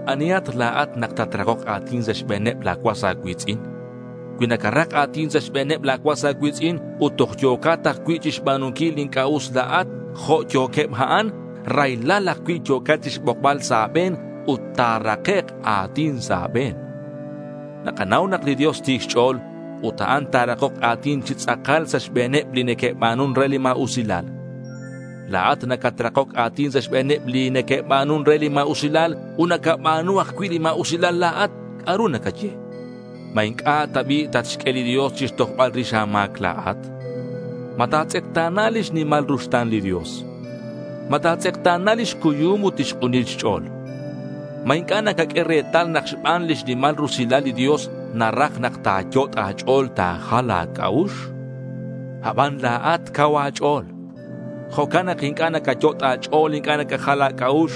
¿Anihat la̱at nak tatrakok a̱tin sa' xbe̱neb la̱ cuas a̱cui̱tz'in? Cui nacarak a̱tin sa' xbe̱neb la̱ cuas a̱cui̱tz'in ut toj yo̱cat ajcui' chixba̱nunquil li inc'a' us la̱at jo' yo̱queb a'an, raylal ajcui' yo̱cat chixbokbal sa' a̱be̱n ut ta̱rakek' a̱tin sa' a̱be̱n. Nakanau nak li Dios ti̱c xch'o̱l ut a'an ta̱rakok a̱tin chi tz'akal sa' xbe̱neb li neque'ba̱nun re li ma̱usilal. La̱at nacatrakoc a̱tin sa' xbe̱neb li neque'ba̱nun re li ma̱usilal ut nacaba̱nu ajcui' li ma̱usilal la̱at. ¿C'a'ru nacaye? ¿Ma inc'a' ta bi' tatxq'ue li Dios chixtojbal rix a̱ma̱c la̱at? ¿Ma ta̱tz'ekta̱na lix nimal ruxta̱n li Dios? ¿Ma ta̱tz'ekta̱na lix cuyum ut lix k'unil xch'o̱l? ¿Ma inc'a' nacaq'ue retal nak xban lix nimal rusilal li Dios naraj nak ta̱yot' a̱ch'o̱l ta̱jal a̱c'a'ux? Aban la̱at cau a̱ch'o̱l. Jo'can nak inc'a' nacayot' a̱ch'o̱l inc'a' nacajal a̱c'a'ux.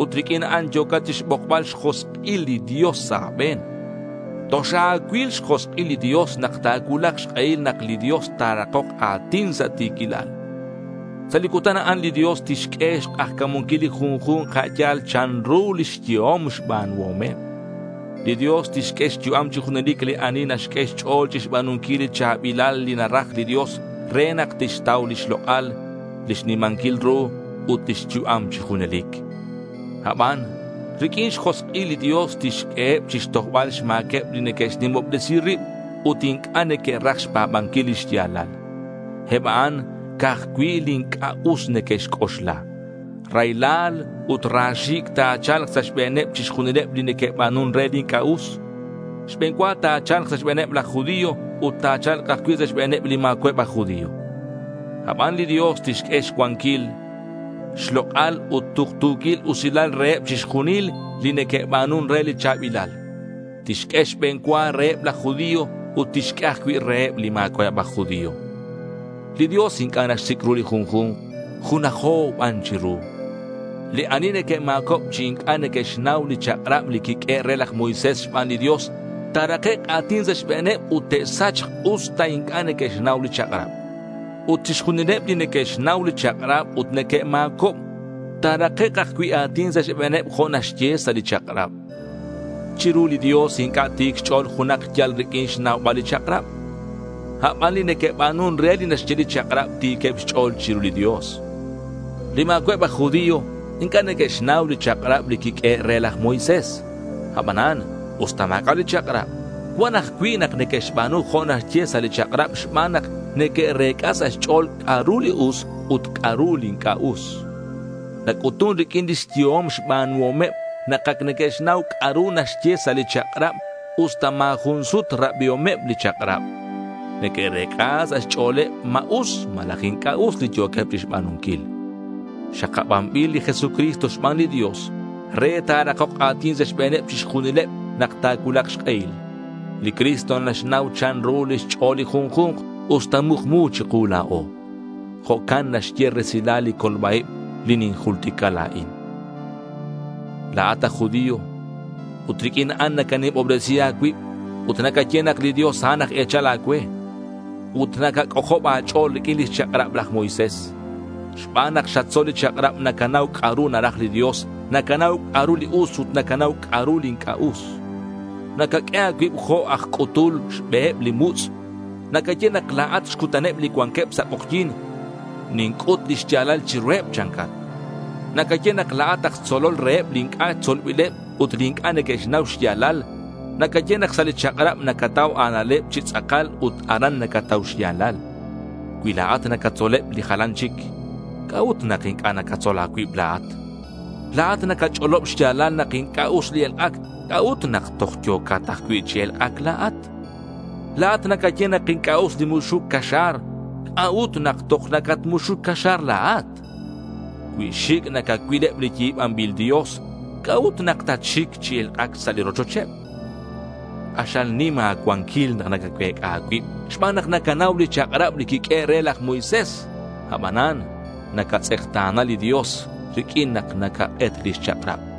Ut riq'uin a'an yo̱cat chixbokbal xjosk'il li Dios sa' a̱be̱n. Toxa̱cuil xjosk'il nak ta̱cuulak xk'ehil nak li Dios ta̱rakok a̱tin sa' ti̱quilal. Sa' li cutan a'an li Dios tixq'ue xk'ajca̱munquil li junju̱nk a' yal chanru lix yehom xba̱nuhomeb. Li Dios tixq'ue xyu'am chi junelic li ani naxq'ue xch'o̱l chixba̱nunquil li cha̱bilal li naraj li Dios re nak tixtau lix lok'al, lix nimanquil ru, ut lix yu'am chi junelic. Aban riq'uin xjosk'il li Dios tixq'ueheb chixtojbal xma̱queb li neque'xnimobresi rib ut inc'a' neque'raj xpa̱banquil li xya̱lal. Eb a'an ca'aj cui' li inc'a' us neque'xc'oxla. Raylal ut ra xi̱c' ta̱cha̱lk sa' xbe̱neb chixjunileb li neque'ba̱nun re li inc'a' us. Xbe̱n cua ta̱cha̱lk sa' xbe̱neb laj judío ut ta̱cha̱lk ajcui' sa' xbe̱neb li ma̱cua'eb aj judío. Aban li Dios tixq'ue xcuanquil, xlok'al ut tuktu̱quil usilal reheb chixjunileb li neque'ba̱nun re li cha̱bilal. Tixq'ue xbe̱n cua reheb laj judío ut tixq'ue ajcui' reheb li ma̱cua'eb aj judío. Li Dios inc'a' naxsic' ru li junju̱nk. Junajo ban chiru. Li ani neque'ma̱cob chi inc'a' neque'xnau li chak'rab li quiq'uehe' re laj Moisés xban li Dios, ta̱rakek' a̱tin sa' xbe̱neb ut te'sachk usta inc'a' neque'xnau li chak'rab. Ut chixjunileb li neque'xnau li chak'rab ut neque'ma̱cob, ta̱rakek' ajcui' a̱tin sa' xbe̱neb jo' naxye sa' li chak'rab. Chiru li Dios inc'a' ti̱c xch'o̱l junak yal riq'uin xnaubal li chak'rab. Aban li neque'ba̱nun re li naxye li chak'rab ti̱queb xch'o̱l chiru li Dios. Li ma̱cua'eb aj judío inc'a' neque'xnau li chak'rab li quiq'uehe' re laj Moisés. Abanan usta ma̱c'a' li chak'rab, cuan ajcui' nak neque'xba̱nu jo' naxye sa' li chak'rab xban nak neque'rec'a sa' xch'o̱l c'a'ru li us ut c'a'ru li inc'a' us. Nac'utun riq'uin lix yehom xba̱nuhomeb nak ac neque'xnau c'a'ru naxye sa' li chak'rab usta ma̱ jun sut rabiomeb li chak'rab. Neque'rec'a sa' xch'o̱leb ma us malaj inc'a' us li yo̱queb chixba̱nunquil. Xakabanbil li Jesucristo xban li Dios re ta̱rakok a̱tin sa' xbe̱neb chixjunileb nak ta̱cuulak xk'ehil. Li Cristo naxnau chanru lix ch'o̱l li junju̱nk usta mukmu chiku la̱o. Jo'can naxye resilal li colba-ib li ninjultica la̱in. La̱at aj judío, ut riq'uin a'an nacanimobresi a̱cuib, ut nacaye nak li Dios a'an aj e̱chal a̱cue. Ut nacac'ojob a̱ch'o̱l riq'uin lix chak'rab laj Moisés. Xban nak xatzol li chak'rab, nacanau c'a'ru naraj li Dios. Nacanau c'a'ru li us ut nacanau c'a'ru li inc'a' us. Nacaq'ue a̱cuib jo' aj c'utul xbeheb li mutz'. Nacaye nak la̱at xcutaneb li cuanqueb sa' k'ojyi̱n. Ninc'ut li xya̱lal chiruheb, chancat. Nacaye nak la̱at aj tzolol reheb li inc'a' tzolbileb ut li inc'a' neque'xnau xya̱lal. Nacaye nak sa' li chak'rab nacatau a̱na'leb chi tz'akal ut aran nacatau xya̱lal. Cui la̱at nacatzoleb li jalan chic, ¿c'a'ut nak inc'a' nacatzol a̱cuib la̱at? La̱at nacach'olob xya̱lal nak inc'a' us li elk'ac. ¿C'a'ut nak toj yo̱cat ajcui' chi elk'ac la̱at? La̱at nacaye nak inc'a' us li muxuc caxa̱r. ¿C'a'ut nak toj nacatmuxuc caxa̱r la̱at? Cui xic' nacacuil eb li yi̱banbil dios, ¿c'a'ut nak nacatxic chi elk'ac sa' li rochocheb? K'axal nim a̱cuanquil nak nacacuec'a a̱cuib xban nak nacanau li chak'rab li quiq'uehe' re laj Moisés. Abanan nacatz'ekta̱na li Dios riq'uin nak nacak'et lix chak'rab.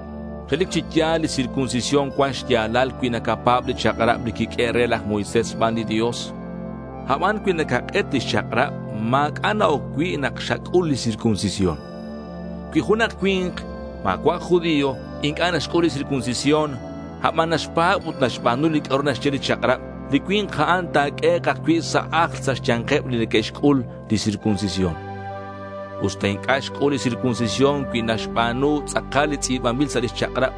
Relic chi ya̱l li circuncisión cuan xya̱lal cui nacapa̱b li chak'rab li quiq'uehe' re laj Moisés xban li Dios. Aban cui nacak'et lix chak'rab ma̱c'a' na-oc cui' nak xac'ul li circuncisión. Cui junak cui̱nk ma̱cua' aj judío inc'a' naxc'ul li circuncisión, aban naxpa̱b ut naxba̱nu li c'a'ru naxye li chak'rab, li cui̱nk a'an ta̱q'uehek' ajcui' sa' ajl sa' xya̱nkeb li que'xc'ul li circuncisión. Usta inc'a' xc'ul li circuncisión cui naxba̱nu tz'akal li tz'i̱banbil sa' li chak'rab,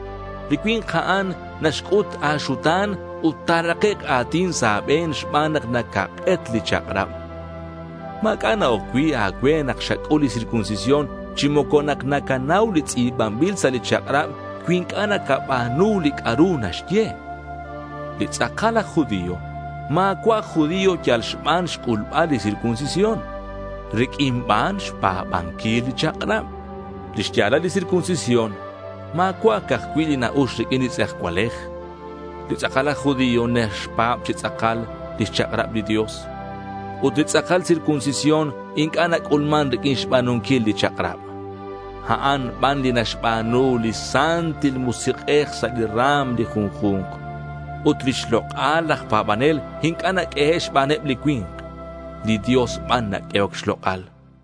li cui̱nk a'an naxc'ut a̱xuta̱n ut ta̱rakek' a̱tin sa' a̱be̱n xban nak nacak'et li chak'rab. Ma̱c'a' na-oc cui' a̱cue nak xac'ul li circuncisión, chi moco nak nacanau li tz'i̱banbil sa' li chak'rab cui inc'a' nacaba̱nu li c'a'ru naxye. Li tz'akal aj judío ma̱cua' aj judío yal xban xc'ulbal li circuncisión. Riq'uin ban xpa̱banquil li chak'rab. Lix ya̱lal li circuncisión ma̱cua' ca'aj cui' li na-ux riq'uin li tz'ejcualej. Li tz'akal aj judío naxpa̱b chi tz'akal lix chak'rab li Dios. Ut li tz'akal circuncisión inc'a' nac'ulman riq'uin xba̱nunquil li chak'rab. A'an ban li naxba̱nu li Santil Musik'ej sa' li ra̱m li junju̱nk. Ut lix lok'al laj pa̱banel inc'a' naq'uehe' xbaneb li cui̱nk. Li Dios ban naq'uehoc xlok'al.